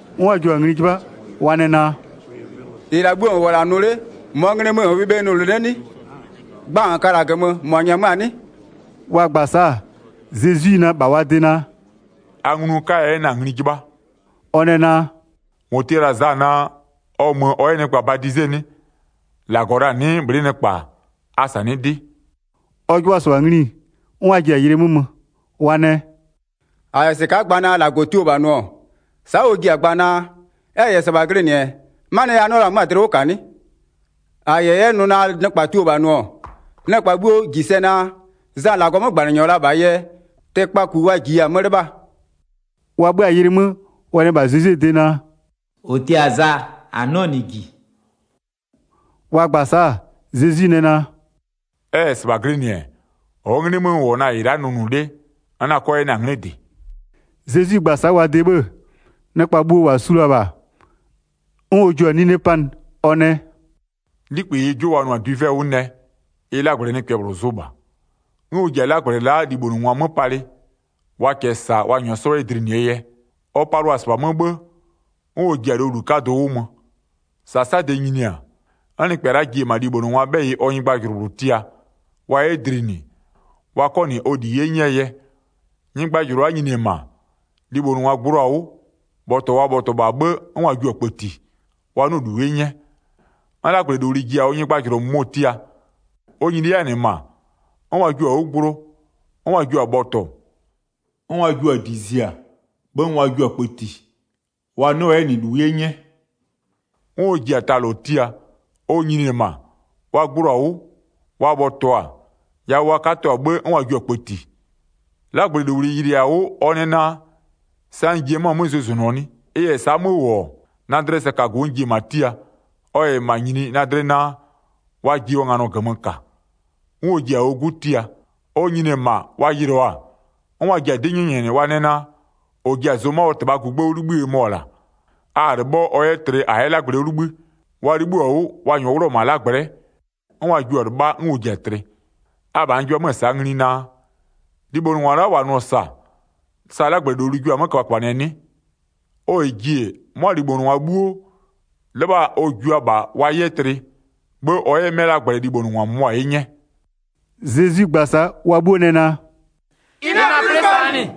'N wa jio-a ngli 'jɩbha, wa nɛ naa: “-Ɩ la'a 'bhuo -n -wʋ-ɔ -la nʋ 'le, -mɔɔ nglɩ mö -n -wʋɩ bhe nʋnʋ 'le 'nɩ? Gba -a -n ka-a -la -mɔ -nyɛmöa-a 'nɩ?” Wa gba-a sa'a, Zezwi nɛ -bha wa de naa: “A nglu n 'kaya 'yɛ na-a ngli 'jɩbha.” Ɔ nɛ naa: “-Mɔ tia la-a Za naa, ɔ mö ɔ 'yɛ nɩkpa badize 'nɩ? -Lagɔ la-a 'nɩɩ bhlɩ'ɩ nɩkpa-a? A -sanɩ'ɩ 'dɩ.” Ɔ 'jɩbhʋa-a -sɩbha ngli, 'n wa ji-a yɩlɩ 'mö mö, wa nɛ: “-A -yɛ -sɩka'a gba naa -Lagɔ tio -bha nʋ-ɔ, sa'a ɔ ji-a gba naa: Ɛ -yɛ -sɩbha glɩnɩ-ɛ, 'manɩɛ yɛ a 'nɩɔ la 'mö-a dlɩ 'wʋ -ka 'nɩ? 6-A -yɛ 'yɛ nʋ naa nɩkpa tio la-a nʋ-ɔ, nɩkpa 'bhuo -ji sɛ naa, Za -Lagɔɔ 'mögbanɩnyɔ la -bhaa yɛ, tɩkpaku wa -jiya-a 'mö 'lɩbhaa.” Wa 'bhö-a yɩlɩ 'mö, wa nɛ -bha Zezwie de naa: “-Ɔ tia Za -a 'nɩɔ -nɩ -ji.” Wa gba-a sa'a, Zezwi nɛ naa: “Ɛ -yɛ -sɩbha glɩnɩ-ɛ, -ɔɔ 'nglɩ 'mö n -wʋ-ɔ na-a -ɩ la'a nʋnʋ 'le, n 'na 'kɔ 'yɛ na-a 'nglɩ -dɩ.” Zezwi gba-a sa'a wa de 'bhë-ë, nɩkpa bhuo -wa su la-a -bha, 'n ɔ jua-a nine la'a 'panɩ, ɔ nɛ: “'Likpï -ɩɩ 'jʋ wa nʋ-a dwivɛ 'wʋ nɛ, ɩ 'lagblɛ nɩkpɛ -bhlʋ zʋ -bha. 'N ɔ ji-a 'lagblɛ la'a libhonʋngwa 'mö palɩ, wa -kɛɛ -sa ɔ -nyʋa 'sɔ 'yɛ dlinɩɛ yɛ. Ɔ palʋa-a -sɩbha 'mö 'bhë, 'n ɔ ji-a lowlu 'kadʋ 'wʋ mö. 10-Sasade nyini-a, 'n nɩkpɛ la'a ji-e -ma libhonʋngwaa 'bhɛyɩ ɔ nyɩgbajʋlʋ -bhlʋ tia, wa 'yɛ dlinɩ, wa 'kɔ -nɩ ɔ -li 'ye 'nyɛɛ yɛ. Nyɩgbajʋlʋ la'a nyini-e -ma, libhonʋngwa gbloo-a 'wʋ, bhɔtɔ wa bhɔtɔɔ -bha 'bhë, 'n wa jio-a kpëti, wa 'nɩɔ-ɔ -lu 'ye 'nyɛ. 'N 'lagblɛlowli ji-a ɔ nyɩgbajʋlʋ -mʋmɔ tia. Ɔ nyini 'yɛ-a -nɩ -ma, 'n wa jio-a 'wʋ gblo, 'n wa jio-a bhɔtɔ, 'n wa jio-a -di zia, 'bhë 'n wa jio-a kpëti, wa 'nɩɔ-ɔ 'yɛ -nɩ -lu 'ye 'nyɛ. 'N ɔ ji-a ta -lɔ tia. Ɔ nyini-e -ma, wa gbloo-a 'wʋ, wa bhɔtɔ-a, yawʋ wa 'katɔ-a 'bhë 'n wa jio-a kpëti. 'Lagblɛlowli yɩlɩɩ-a 'wʋ ɔ nɛ naa: Sa n ji-e la'a 'mö zʋzʋnʋɔ 'nɩ? Ɩ -yɛ sa'a 'mö -wʋ-ɔ, na dlɩɛ sɛkagu n ji-e -ma tia, ɔ -yɛ -ma nyini, na dlɩ naa, wa ji ɔ nganɔ -gömö -ka. 'N ɔ ji-a ɔ 'gu tia. Ɔ nyini-e -ma, wa yɩlɩɔ-a, 'n wa ji-a 'dɩ 'nyɛnyɛnɩ, wa nɛ naa: -Ɔ ji-a zʋma ɔ -tɩbhaa gugbë 'wʋ 'libhïë mɔ-ɔ -la, a-a 'lɩbhɔ ɔ 'yɛ tlɩ -a 'yɛ 'lagblɛ 'wʋ 'libhï. Wa 'libhïɔ-a 'wʋ, wa -nyɔɔ 'wlʋ-ɔ -ma 'lagblɛ'ɛ, 'n wa jio-a 'lɩbha, 'n ɔ ji-a tlɩ. Abha n 'jɩbha 'mö-ö sa'a ngli naa: Libhonʋngwa la'a -wa nʋ-ɔ -sa, sa 'lagblɛlowli jua-a 'mö köbhaköbhanɩɛ 'nɩ? Ɔ -yɛ ji-e, 'mʋa libhonʋngwa 'bhuo, 'lɩbha ɔ jua -bha wa 'yɛ tlɩ, 'bhë ɔ 'yɛ 'mɛ 'lagblɛ libhonʋngwa -mʋmʋa 'ye 'nyɛ.” Zezwi gba-a sa'a, wa 'bhuo nɛ naa: “Ɩ 'na-a 'plɩ -sɩbha -nɩ.”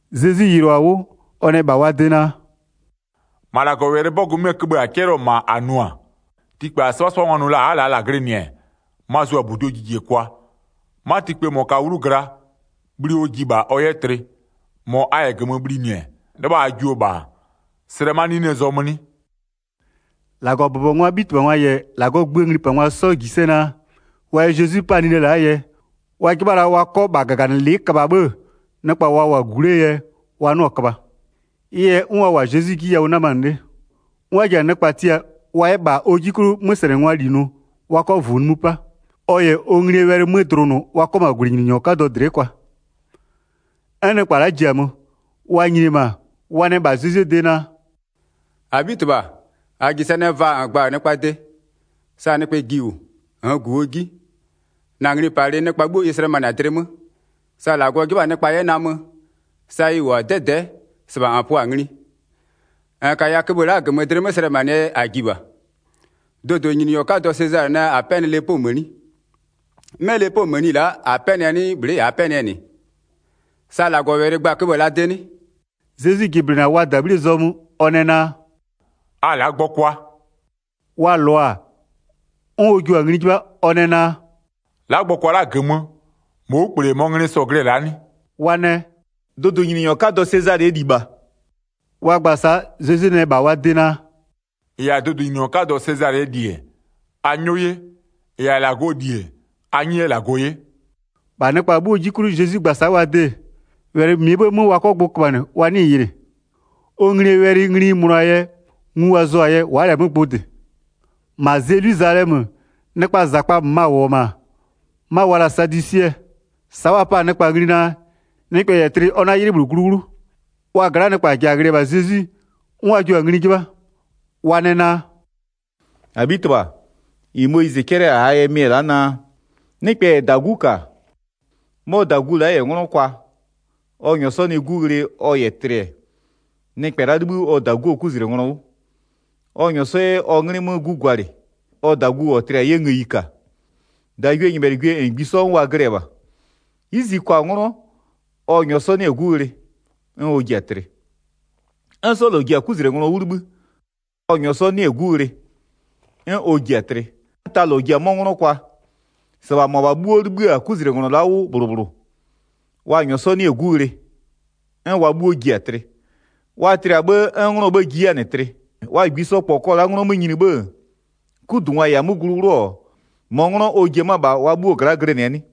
Zezwi yɩlʋa-a 'wʋ, ɔ nɛ -bha wa de naa: “-Ma -Lagɔwɛlɩɛ 'bɔgʋ 'möö wɛlɩköbhë la'a -a 'cɛlɩɔ-ɔ -ma, -a nʋ-a: Tikpë -a 'sɩbhasɩbhangwa nʋ la-a a'a -laa -la glɩnɩ-ɛ, ma-a zʋ-a -buduo jijekwa. 'Ma tikpë -mɔ -kaa 'wlu gla, bhli ɔ ji -bha ɔ 'yɛ tlɩ. -Mɔ a -yɛ 'yɛ -gömö bhlinɩ-ɛ, 'lɩbha a jio -bha-a, slɛ 'ma 'ninee zɔmö 'nɩ?” 19-Lagɔbʋbɔngwaa 'bhitɩbhangwa -yɛ -Lagɔɔ gböö nglipangwa 'sɔ -ji sɛ naa, wa yɛ Zezwi 'pa-a nine la'aa yɛ, wa 'jɩbha la wa 'kɔ -bha -gaganɩlɩ'ɩ köbha 'bhë-ë, nɩkpa wa -wʋ-a -gu 'lee yɛ, wa 'nɩɔ-ɔ köbha. Ɩ yɛ 'n wa -wʋ-a Zezwi 'ji yawʋ 'namanɩ 'le. 'N wa ji-a nɩkpa tia wa 'yɛ -bha ɔ 'ji 'klʋ 'möslɛnɩngwaa -li nʋ, wa 'kɔ -vuu nimï 'pa, ɔ -yɛ ɔ nglie wɛlɩ 'mö dlʋnʋ wa 'kɔ -ma -gwlɩnyininyɔ 'kadɔ dlɩ'ɩ kwa. 'N nɩkpa la'a ji-a mö. Wa nyini-e -ma, wa nɛ -bha Zezwie de naa: “-Abhitɩbha, -a -ji sɛ naa, vaa -n gba-a nɩkpaa de, sa nɩkpɛ ji -wʋ -nn -gu ɔ 'ji, -na nglipalɩ nɩkpa 'bhuo ɩ slɛmanɩ-a dlɩ 'mö, sa -Lagɔ 'jɩbha-a nɩkpa 'yɛ namö, sa ɩ -wʋ-a 'dɛdɛ'ɛ -sɩbha -n pʋa-a ngli. 22-N -kaya köbhë la'a -gömö dlɩ 'mö slɛmanɩɛ yɛ -a ji -bha. Dʋdʋnyininyɔ 'kadɔ Sezalɩ nɛ -a 'pɛnɩ lepoo mëni. 'Mɛ lepoo mëni la'a, -a 'pɛnɩɛ 'nɩɩ, bhlɩ'ɩ -aa 'pɛnɩɛ -nɩ? Sa -Lagɔwɛlɩ gba-a köbhë la'aa de 'nɩ?” Zezwi jɩblɩnɩ-a wa -dabhlie zɔmö, ɔ nɛ naa: “A la'a gbɔkwa.” Wa -lɔ-a, 'n ɔ jua-a ngli 'jɩbha, ɔ nɛ naa: “La'a gbɔkwa la'a -gömö, -mɔɔ 'wlukple -yɛ -mɔɔ nglɩ sɔ-ɔ glɩ-ɛ la'a 'nɩ?” Wa nɛ: “Dʋdʋnyininyɔ 'kadɔ Sezalɩɛ -li -bha.” Wa gba-a sa'a Zezwi nɛ -bha wa de naa: “-Ɩ yɛ-a dʋdʋnyininyɔ 'kadɔ Sezalɩɛ -li-e, a 'nyɔ 'ye, -ɩ -yɛ-a -Lagɔɔ -li-e, a 'nyɩ 'yɛ -Lagɔ 'ye.” 26-Bha nɩkpa 'bhuoo 'ji 'klʋ Zezwi gba-a sa'a wa de, wɛlɩ -mɩɛ 'bhë 'mö wa 'kɔ gbʋ köbhanɩ, wa 'nɩɩ-ɩ yɩlɩ. Ɔ nglie wɛlɩ ngli ɩ mönʋa-aa yɛ, ngu wa zʋ-a yɛ, wa'a -lɛ-a 'mö gbʋ -dɩ. Ma Zelwizalɛmö, nɩkpaa -zakpa -möma -wʋ-ɔ -ma, 'ma wa la-a sadwisɩɛ. Sa'a wa pa-a nɩkpa ngli naa, nɩkpɛ -yɛ tlɩ ɔ 'na 'ylɩ -bhlʋ glu 'wlʋ. Wa gla'aa nɩkpa ja ghlɩ-ɛ -bha Zezwi, 'n wa jio-a ngli 'jɩbha. Wa nɛ naa: “-Abhitɩbha, -ɩ Moyizɩ 'cɛlɩ-a -aa yɛ mɩ-ɛ la'a naa: Nɩkpɛ -yɛ -dagu -ka, 'mɔ -dagu la'a -yɛ 'nglɔ kwa, ɔ -nyɔɔ 'sɔ nɩ 'gu ghlɩ ɔ -yɛ tlɩ-ɛ, nɩkpɛ la'a 'libhï ɔ -daguo 'kuzlenglɔ 'wʋ, ɔ -nyɔɔ 'sɔ 'yɛ ɔ 'nglɩ 'mö 'gu gwalɩ, ɔ -dagu -ɔ tlɩ-a 'yɛ ngëyi -ka. 29-Dagwienyɩbhɛlɩgwie -ngbisɔ, 'n wa glɩ-ɛ -bha. 'Yizi kwa-a 'nglɔ, ɔ -nyɔɔ 'sɔ 'nɩ-ɛ 'gu ghlɩ, 'n ɔ ji-a tlɩ. 'N 'sɔ -lɔ ji-a 'kuzlenglɔ 'wʋ 'libhï, ɔ -nyɔɔ 'sɔ 'nɩ-ɛ 'gu ghlɩ, 'n ɔ ji-a tlɩ. 'N ta -lɔ ji-a 'mɔ nglɔ kwa. -Sɩbha -mʋabha 'bhuo 'libhï-a 'kuzlenglɔ la'a 'wʋ -bhlʋ -bhlʋ, wa -nyɔɔ 'sɔ 'nɩ-ɛ 'gu ghlɩ, 'n wa 'bhuo ji-a tlɩ. Wa tlɩ-a 'bhë, 'n nglɔɔ 'bhë ji 'yɛ-a -nɩ tlɩ. Wa -ngbisɔ -kpɔ kɔ la'a 'nglɔ 'mö nyini 'bhë-ë, 'kudungwa -yɛ-a 'mö glu 'wlʋ-ɔ, -mɔɔ 'nglɔ ɔ ji-a 'mö-ö -bha wa 'bhuo gla'a glɩnɩɛ 'nɩ?”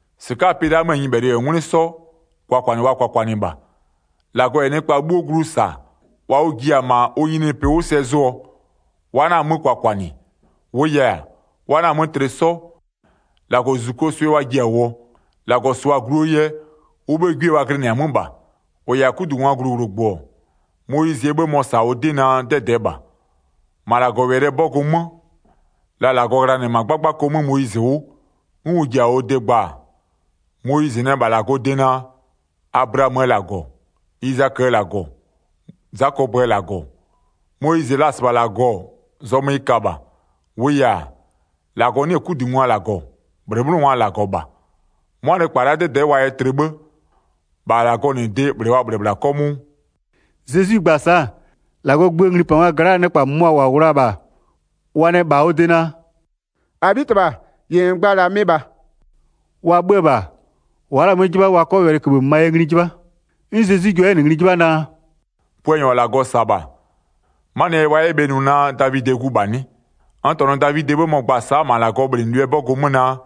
Zezwi nɛ naa: “-Sɩka'aa pɩ la'a möö nyɩbhɛlɩ -yɛ 'ngwlɩ 'sɔ, kwakwanɩ wa kwakwanɩ -bha. 35-Lagɔ -yɛ nɩkpa 'bhuo glu -sa-a, -wa ʋ ji-a -ma ʋ nyininyinipɩ 'wʋ sɛ zʋɔ, wa 'na-a 'mö kwakwanɩ. 36-Wʋʋ yɛ-a, wa 'na-a 'mö tlɩ 'sɔ, -Lagɔzuzukuo swɩ wa ji-a -wʋɔ. -Lagɔ -sʋa-a gluo yɛ, ʋ 'bhëë 'gwie wa glɩnɩ-a 'mö -bha. 37-Ʋ -yɛ-a 'kudungwaa gluwlʋgbʋ-ɔ, Moyizɩɛ 'bhë mɔ-ɔ -sa-a ʋ 'dɩ naa, 'dɛdɛɛ -bha. -Ma -Lagɔwɛlɩɛ 'bɔgʋ 'mö la -Lagɔ ghlanɩ-ɛ -ma 'gbagbako 'mö Moyizɩ 'wʋ, 'n ʋ ji-a ɔ de gba-a, Moyizɩ nɛ -bha -Lagɔɔ de naa: Ablaamöö -Lagɔ, Izaköö -Lagɔ, Zakɔpöö -Lagɔ. Moyizɩ la-a -sɩbha -Lagɔ, zɔmö ɩ ka -bha. 38-Wʋʋ yɛ-a, -Lagɔ 'nɩ-ɛ 'kudungwaa -Lagɔ, -bhlɩbhlɩngwaa -Lagɔɔ -bha. 'Mʋa nɩkpa la'a, 'dɛdɛ'ɛ wa yɛ tlɩ 'bhë, -bha -Lagɔ -nɩ de -bhlɩ wa -bhlɩ-ɛ -bhla 'kɔmʋʋ.” 39Zezwi gba-a sa'a, -Lagɔɔ gböö nglipangwa gla'aa nɩkpa -mʋmʋa -wa -wʋ la-a -bha, wa nɛ -bha ɔ de naa: “-Abhitɩbha, -ɩ -n gba-a -la mɩ -bha.” 40Wa 'bhö-ö -bha, wa'a -la-a 'mö 'jɩbha wa 'kɔ wɛlɩköbhë -mömaa yɛ ngli 'jɩbha. Puanyɔ -ɔ -Lagɔ -sa-a -bha -mɔɔ gu-a 'nɩ? 41'N Zezwi jua 'yɛ-a -nɩ ngli 'jɩbha naa: “Puanyɔ -ɔ -Lagɔ -sa-a -bha, 'manɩɛ yɛ wa 'yɛ bhe nʋ naa Davidɩɛ gu -bha 'nɩ? 42N -tɔnʋ Davidɩɛ 'bhë mɔ-ɔ gba sa'a -ma -Lagɔɔ bhlɩnɩlʋɩɛ 'bɔgʋ 'mö naa: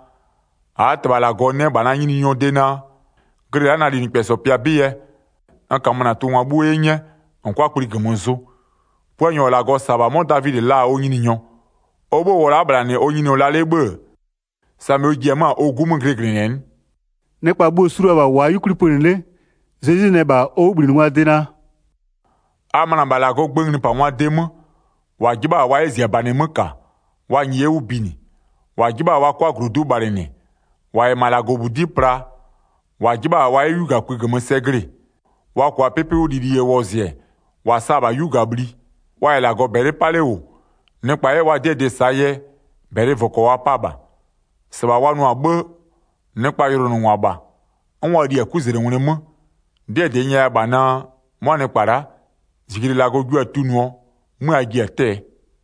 -Aa -Tɩbha -Lagɔ nɛ -bha na Nyininyɔɔ de naa: Glɩ la'a na linɩkpɛsɔ pɩa 'bɩ yɛ, 43n -kamö -na tʋngwa 'bhuo 'ye 'nyɛ -n 'kʋa kpli -gömö zʋ. 44Puanyɔ -ɔ -Lagɔ -sa-a -bha 'mɔ Davidɩ la-a ɔ Nyininyɔ. Ɔ 'bhë -wʋɔ la'a -bhla -nɩ ɔ Nyininyɔ la 'le 'bhë-ë, samɩ ɔ ji-e 'mö-a ɔ 'gu 'mö glɩglɩnɩɛ 'nɩ?” Zezwi nɛ naa: A 'na-a zʋ 'kwlɩsɔkangwa -nɩ 45Nɩkpa bhuo-o su la-a -bha -wʋ-a 'yukwli pönɩ 'le, Zezwi nɛ -bha ɔ 'wʋbhlinɩngwaa de naa: 46“A möna -bha -Lagɔɔ gböö nglipangwaa de 'mö, -wa 'jɩbha-a wa 'yɛ -ziabanɩ 'mö -ka, wa -nyɩɩ 'yɛ 'wʋ binɩ, -wa 'jɩbha-a wa 'kʋa -glodu'u bhalɩnɩ, -wa -yɛ -ma -Lagɔbudi'i pla, -wa 'jɩbha-a wa 'yɛ 'yugakpï -gömö sɛ glɩ-ɩ, wa -kʋa 'pɩpɩ 'wʋ lili yɛ wɔzɩ-ɛ, -wa sa-a -bha 'yugabhli. 47Wa -yɛ -Lagɔ -bɛlɩ 'pa 'le -wʋ, nɩkpa 'yɛ wa 'dɩɛ dɩ -saa yɛ, -bɛlɩvʋkɔ wa pa -bha. -Sɩbha wa nʋ-a 'bhë, nɩkpaa yʋlʋnʋngwa -bha. 'N wa li-a 'kuzlengwlɩ 'mö. 'Dɩɛ -dɩ n nyɛya -bha naa: 'Mʋa nɩkpa la'a, -zijle -Lagɔ jua-a tunʋɔ, 'mö a ji-a 'tɛ-ɛ.”